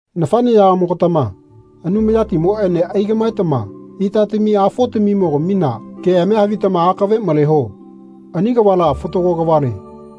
Nafaneyakamogatama Anumayatimoene aigamaetama itaamimi-afoamimogamina keamia havitama akave maleho. Ani kavala fatago kavale.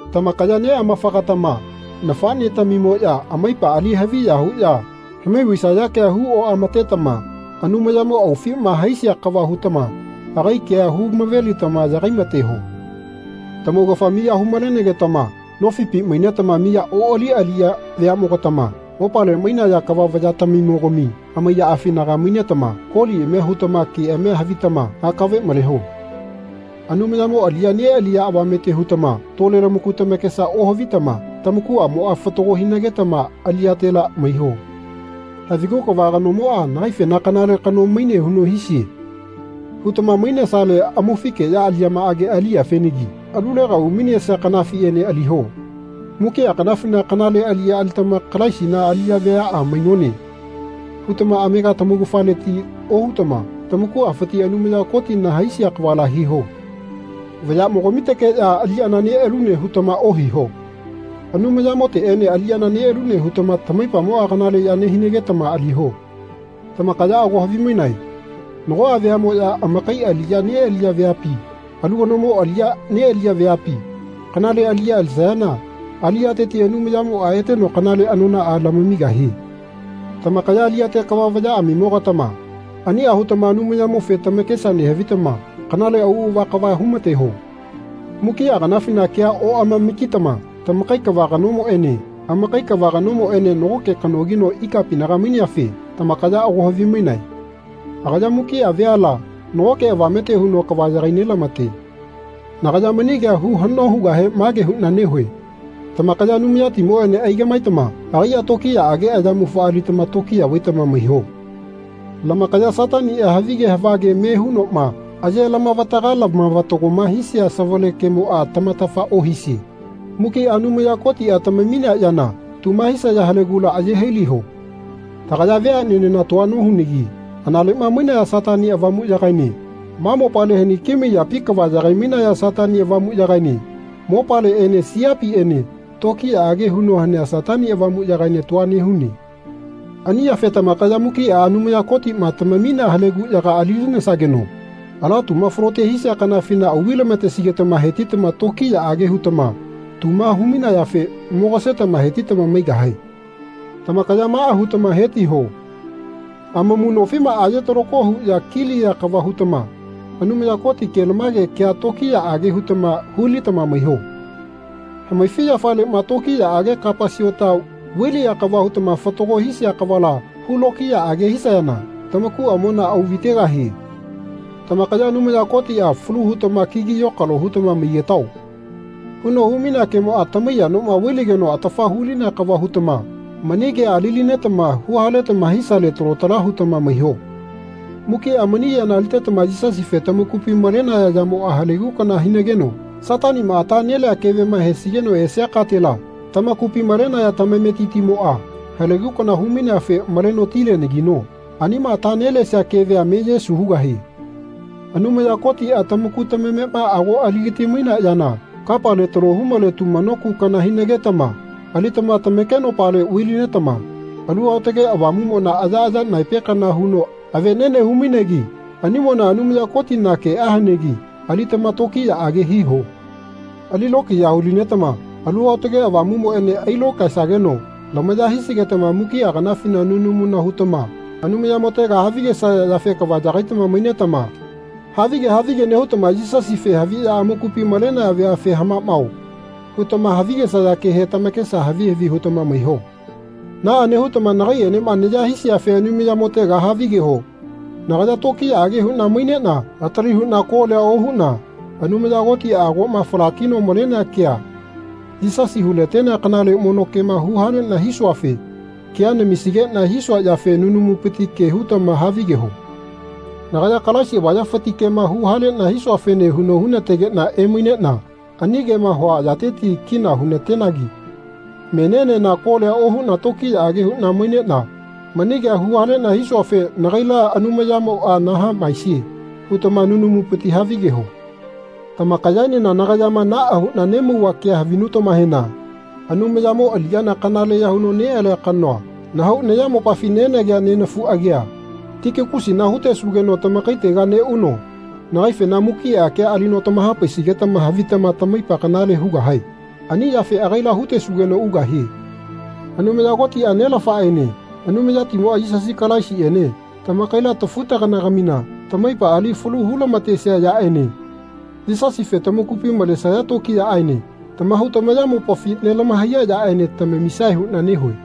Tamakaya neamafagatama nafanetamimoya amaipa ali haviya huya hamai vaisaya kea huoamatetama Anumayamo aufima haisia kava hutama agai kea humavelitama yagai mateho. Tamaugafa miya hu-malenage-tama nofipi mainetama miya oali aliya veamogatama mopale mainaya kava vayatamimogami amaiyaafinaga mainetama koliami hutama keamia havitama akave maleho. Anumayamo aliya nealiya avamete hutama tole lamaku tamakesa ohavitama tamakuamoa fatago hinagetama aliyatela maiho. Havigu Kava kanomoa nagaifena kanale kano maine huno hisie. hutama mainesale amaufikeya aliyamaage aliyafenagi alulega umainesia kanafiene aliho. Mukia kanafina kanale aliya alitama Kalaisina aliya veaa mainone. hutama amega tamaugafaleti ohutama tamakuafiti Anumaya Kotina haisia kavala hiho. Vayamogamitekeya aliyana nealune hutama ohiho Anumayamoteene aliyana nealune hutama tamaipamoa kanaleya nehinagetama aliho. Tamakaya ago havimainae nagoa veamoya amakai aliya nealiya veapi alu kanomo aliya nealiya veapi kanale aliya alisayana aliyateti Anumayamoa eteno kanale anonaa lamamigahie. Tamakaya aliyate kava vayaamimogatama ania hutama Anumayamofe tamakesa nehavitama kanale auava kava humateho. Mukia kanafina kea oamamakitama tamakai kava kanomoene amakai kava kanomoene nagoke kanogino ikapinaga maineafe tamakaya ago havimainae. Agaya mukia veala nagoke avamete huno kava yagai nelamate. Nagaya mani kea hu hano hugahe mage huna nehue. Tamakaya Anumayatimoene aigamaetama agaia tokiyaage ayamufa alitama tokiya vaitama maiho. Lamakaya Satania havige havage me hunoma aye-lamavataga lamavatagoma hisia savale kemoa tamatafa ohisie mukia Anumaya Kotia tamaminea yana tuma hisaya halegula aye hailiho. Tagaya veanenena tua nohunagi analema mainaya Satani Avamuyagaene ma mopale haniki maiyapi kava yagai-mainaya Satani Avamuyagaene mopaleene siapiene tokiyaage huno hanea Satani Avamuyagaene tua nehune. Ani yafe tamakaya mukia Anumaya Kotima tamaminea haleguyaga ali-linesageno ala tuma falote hisia kanafina auvai-lamatesigetama hetitama tokiyaage hutama tuma hu-mainayafe mogasetama hetitama maigahae. Tamakaya maa hutama hetiho. Amamu nofimaa aye-talako huya kiliya kava hutama Anumaya Koti kelamage kea lokiyaage hutama hulitama maiho. Hamaifiyafalema tokiyaage kapa siota vai-liya kava hutama fatago hisia kavala hulokiyaage hisayana tamakuamona auvaitegahie. Tamakaya Anumaya Kotia Falu hutama kigi yokalo hutama maigetao. huno humainea kemoa tamaiya noma vailigeno atafa hulinea kava hutama mani kea ali-linetama huhaletama hisale talo tala hutama maiho. Mukia mani yana alitetama Yisasife tamakupi malenaya yamoa halegu kana hinageno Satanima ata nelea kevema hesigeno esia katela tamakupi malenaya tamametitimoa halegu kana hu-maineafe maleno tilegahianagino anima ata nelesia kevema meye su hugahie. Anumaya Kotia tamaku tamamema ago aligati-mainea yana kapale talo humale tumano ku kana hinagetama alitama tamakenopale vai-linetama Alu Aotage Avamumona ayaaya naepe kana huno avenene humainegi animona Anumaya Kotina kea hanegi alitama tokiyaage hiho. Ali lokiya hulinetama Alu Aotage Avamumoene ailokaesageno lamaya hisigetama mukia kanafina nunamuna hutama Anumayamotega havigesaya yafe kava yagaitama mainetama havige havige nehutama Yisasife haviya amakupi malenaya veafe Hamamao. hutama havigesaya kehe tamakesa havi havi hutama maiho. Naa nehutama nakaienema naya hisiafe Anumayamotega havigeho. Nagaya tokiyaage huna mainena atali huna kolia ohuna Anumaya Kotia agoma falakino malenea kea Yisasi hulatenea kanale mono kema huhalena hisuafe kea namisigena hisua yafe nunamupiti ke hutama havigeho. Nagaya Kalaisi avayafiti kema huhalena hisuafene huno hunategena emainena ani kema hua yateti kina hunatenagi menienena kolia ohuna tokiyaage huna mainena mani kea huhalena hisuafe nagaila Anumayamoa nahamaese hutama nunamupiti havigeho. Tamakayaenena nagayama naa huna nemauva kea havinutamahena Anumayamo aliyana kanaleya huno nealia kanoa nahau nayamopafi nenagea nenafu agia Tikikusina hutesugeno tamakaitega neuno nagaifena mukia kea alino tamahapaisigetama havitama tamaipa kanale hugahae. Ani yafe agaila hutesugeno ugahie. Anumaya Kotia, Nelafaene Anumayatimoa, Yisasi Kalaisiene tamakaila tafu-tagana-gatamina tamaipa ali falu hulamatesia yaene Yisasife tamakupi malesaya tokiyaene tamahau tamayamopafi nelahamaiya yaene tamamisae huna nehue.